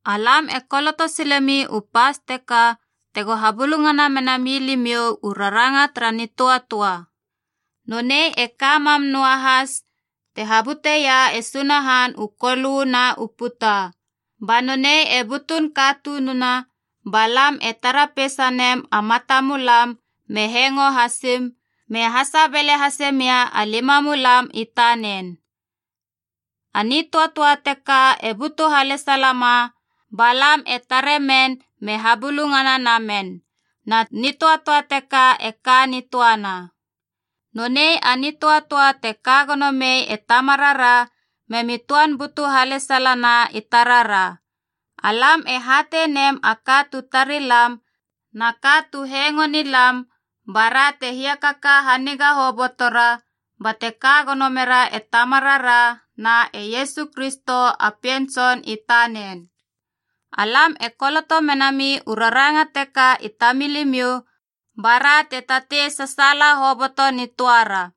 Alam e koloto silemi u pas teka tego habulungana menami limiou u Rarangana tara Nitöatöa. Nonei e ka mam noahas te habuteia e Sunahan u kolö na u puta. Ba nonei e butun katununa ba lam e tara peisanem a mata mulam me hengo hasim, me hasebele hase mia a limamulam i tanen. A nitöatöa teka e butu halesalama ba lam e tare men me habulungana namen, na nitöatöa teka e ka nitöana. Nonei a nitöatöa te kagono mei e Tamarara, memi töan butu halesalana i tarara. Alam e hatei nem a ka tu tari lam na ka tu hengoe nilam bara te hiakaka haniga hobotora, bate ka gono mera e Tamarara na e Iesu Kristo a Pien Tson i tanen. Alam e koloto menami u raranga teka i tamilimiou bara te tatei sasaala hoboto nitöara.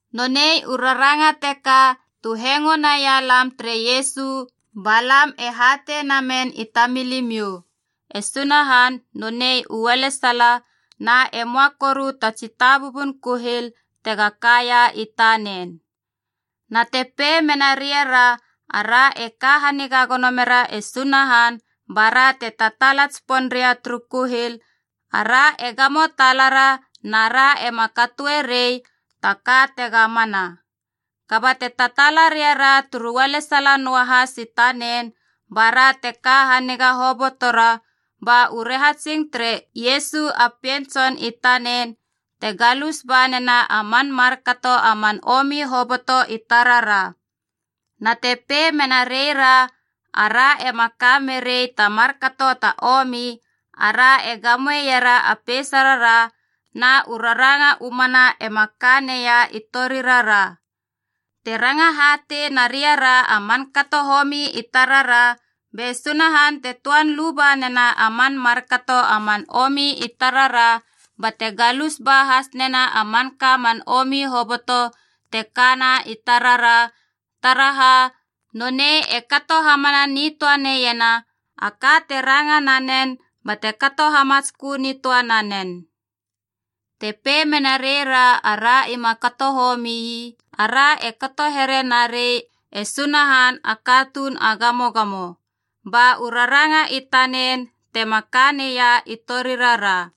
Nonei u raranga teka tu hengo naia lam tere Iesu ba lam e hatei namen i tamilimiou: e Sunahan nonei u ualesala na e möa koru ta tsi tabubun kuhil tega kaia i tanen. Na te pei mena reira, ara e ka haniga gono mera e Sunahan bara te tataala tsipon ria turu kuhil, ara e gamo talara na ra ema katoe rei taka tega mana. Kaba te tataala ria ra turu ualesala noahas i tanen, bara te ka haniga hobotora, ba u rahatsing tere Iesu a Pien Tson i tanen te galus ba nena a man markato a man omi hoboto i tarara. Na te pei mena reira ara ema ka merei ta markato ta omi, ara e gamoera a peisarara, na u raranga u mana ema ka neia i torirara. Te ranga hatei na riara a man kato homi i tarara, be Sunahan te töan luba nena a man markato a man omi i tarara bate galus ba has nena a manka man omi hoboto te kana i tarara, taraha nonei e kato hamana nitöa neiena a ka te ranga nanen bate kato hamatskö nitöa nanen. Te pei mena reira ara ima kato homii, ara e kato here narei, “E Sunahan a katuun a gamogamo.” Ba u raranga i tanen tema ka neia i torirara.